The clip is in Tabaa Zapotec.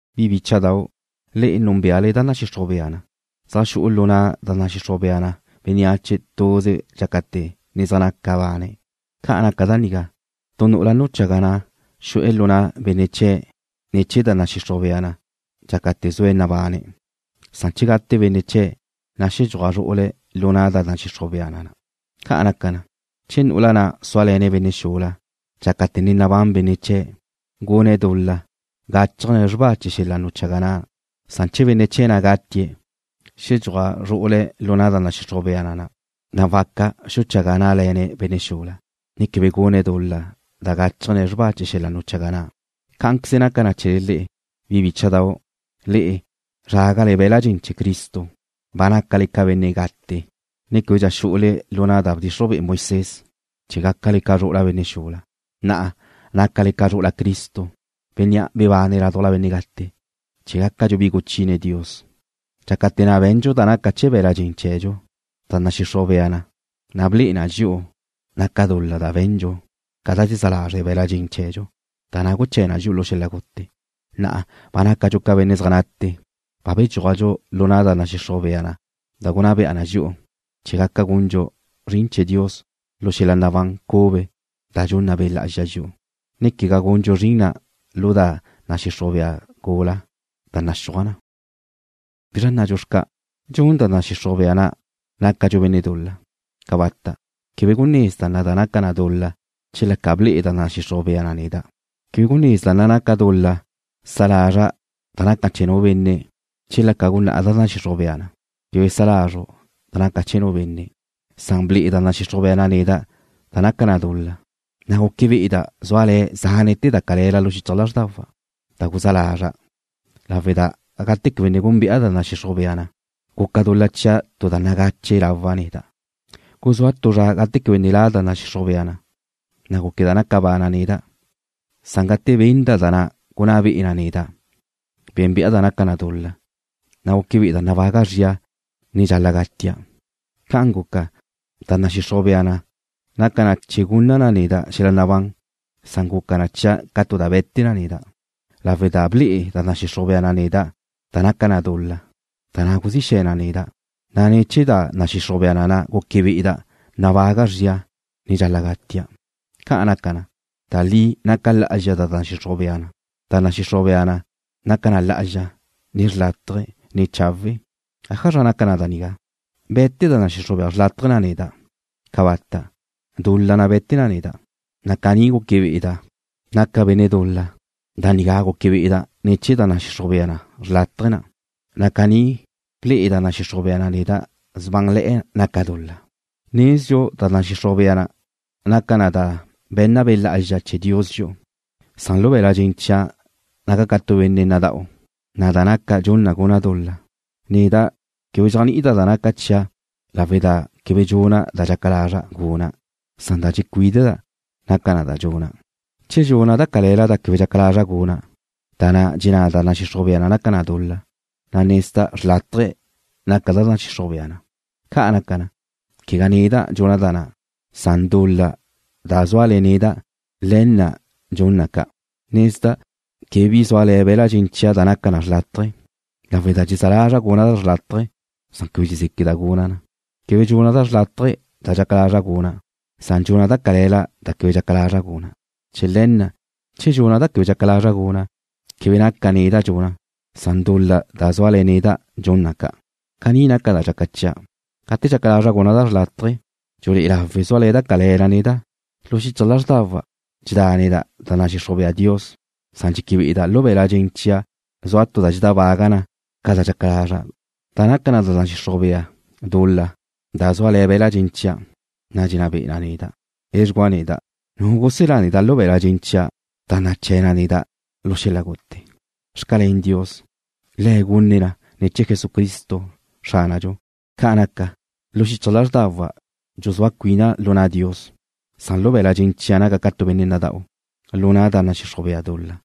Bi bícha'dau', le'e núnbeale da nadxixruj bea na, zaj xu'u lu na' da nadxixruj bea na bénneache tuze dxácate̱ ne zaj naca bane̱'. Ca naca da nigá, tu nu'ula nuchaga na' xu'e̱ lu na' benne' chee̱' ne̱ chee̱ da nadxixruj bea na dxácate̱ zue̱' nabane̱', san che gate benne' chee̱', na' xedxúaj zru'ule̱' lu na' da nadxixruj bea na na'. Ca' naca na, che nu'ula na' súale̱ne̱' benne' xula dxácate̱ ne nabán benne' chee̱', gune̱' dul-la gáchajne̱' xrba chee̱ xel-la nuchaga na', san che benne' chee̱' na' gatie̱', xedxúaj zru'ule̱' lu na' da nadxixruj bea na na', na' waca xuchaga ná'le̱ne̱' benne' xula, ne quebe gune̱' dul-la da gáchajne̱' xrba chee̱ xel-la nuchaga na'. Cá'anqueze naca chee̱le le'e, bi bícha'dau', le'e zrágale be̱l-la' dxen chee̱ Cristo, ba nácale ca benne' gate, ne québedxa xu'ule lu na' da bdxixruj be'e Moisés, chee̱ gácale ca zru'ula benne' xula. Na'a nácale ca zru'ula Cristo, Bénnea' bebane̱' ládujla benne' gate, chee̱ gácadxu bi guchine Dios. Dxácate̱ na' be̱ndxu da naca chee̱ be̱la' dxen chee̱dxu, da nadxixruj bea na ble'e na dxi'u naca dul-la da be̱ndxu ca da dxezá lazre' be̱la' dxen chee̱dxu, na' da na' guché̱ na dxi'u lu xel-la gute. Na'a ba nácadxu ca benne' zaj nate, na' ba bedxúajdxu lu na' da nadxixruj bea na da gunná be'e na dxi'u, chee̱ gaca gundxu zrin chee̱ Dios lu xel-la nabán cube da dxunna Be' Lá'azxa dxi'u, ne quegá gundxu zrin na' lu da nadxixruj bea gula da naxúaj na. ¿Bizra nnadxu xca'? ¿Dxun da nadxixruj bea na nácadxu benne' dul-la? ¡Cabata'! Quebe gunezda' da naca na dul-la chela ca ble'e da nadxixruj bea na neda'. Quebe gunezda' naca dul-la sa lazra' da naca chee̱ nu benne' chela ca gunná da nadxixruj bea na: Quebe sa lazru' da naca chee̱ nu benne'. Ble'e da nadxixruj bea na neda' da naca dul-la, na' guque be'eda' zúale̱'e̱ zánete̱ da cale̱la lu xichaj lázrdawa' da guzá lazra', lawe' da gate quebe ne gúnbe'a da nadxixruj bea na, guca dul-la chia' tu da nagache lawa' neda'. Guzúa tu zra gate quebe ne la' da nadxixruj bea, na' gúqueda' naca bana' neda', san gate benda' da na' gunná be'e na neda', bénbe'a da naca dul-la, na' guque be'eda' nabaga' zria, ne dxal-la' gatia'. Ca'an guca, da nadxixruj bea na' naca na chee̱ gunna na neda' xel-la nabán, san guca na chia' ca tu da be̱te neda' lawe' da ble'e da nadxixruj bea na' neda' da naca na dul-la, da na' guzí xe̱ na neda', na' ne̱ chee̱ da nadxixruj bea na' guque be'eda' nabaga' zria, ne dxal-la' gatia'. Ca' naca na, da li naca lá'azxa da nadxixruj bea na. Da nadxixruj bea na' naca na lá'azxa, ne xrlátaje, ne chawe'. ¿Ájazra naca da nigá? ¿Be̱te da nadxixruj bea xrlátaje na' neda'? ¡Cabata'! Dul-la na' be̱te na neda', na' caní guque be'eda' naca na dul-la. Da nigá guque be'eda' ne̱ chee̱ da nadxixruj bea xrlátaje na', na' caní ble'e da nadxixruj bea na' da sbánle̱'e̱ naca dul-la. Nezdxu da nadxixruj bea na naca na da be̱nna Be' Lá'azxa chee̱ Dios dxi'u, san lu be̱la' dxen chia' naca' ca tu benne' nada'u, na' da naca' dxun na guna' dul-la. Neda' quebe dxéajni'ida' da dxaca chia' lawe' da quebe dxuna' da dxaca lazra' guna', san da dxecuídeda' naca na da dxuna'. Che dxuna' da cale̱la da quebe dxaca lazra' guna', da na' dxenná da nadxixruj bea na naca na dul-la, na' nezda' xrlátaje naca da nadxixruj bea na. Ca' naca na, quegá neda' dxuna' da na', san dul-la da zúale̱ neda', le̱ na' dxun na ca'. Nezda' quebe bi zúale̱ be̱la' dxen chia' da naca xrlátaje, lawe' da dxezá lazra' guna' da xrlátaje, san quebe dxezéqueda' guna' na. Quebe dxuna' da xrlátaje da dxaca lazra' guna', san dxuna' da cale̱la da quebe dxaca lazra' guna'. Chee̱ le̱ na', che dxuna' da quebe dxaca lazra' guna', quebe naca neda' dxuna' na, san dul-la da zúale̱ neda' dxun na ca'. Caní naca da dxaca chia': Gate dxaca lazra' guna' da xrlátaje, dxulé'e lawe zúale̱ da cale̱la neda'. Lu xichaj lázrdawa' dxedáneda' da nadxixruj bea Dios, san dxeque be'eda' lu be̱la' dxen chia' zua tu da dxedábaga na ca da dxaca lazra', da naca da nadxixruj bea dul-la da zúale̱ be̱la' dxen chia', na' dxenná be'e na neda'. ¡Edxugúa neda'! ¿Nu guselá neda' lu be̱la' dxen chia' da naché̱ na neda' lu xel-la gute? Xcalén Dios, Le̱' gune̱' na ne̱ chee̱ Xránadxu Jesucristo. Ca' naca, lu xichaj lázrdawa' dxuzúa cuina' lu na' Dios, san lu be̱la' dxen chia' naca' ca tu benne' nada'u lu na' da nadxixruj bea dul-la.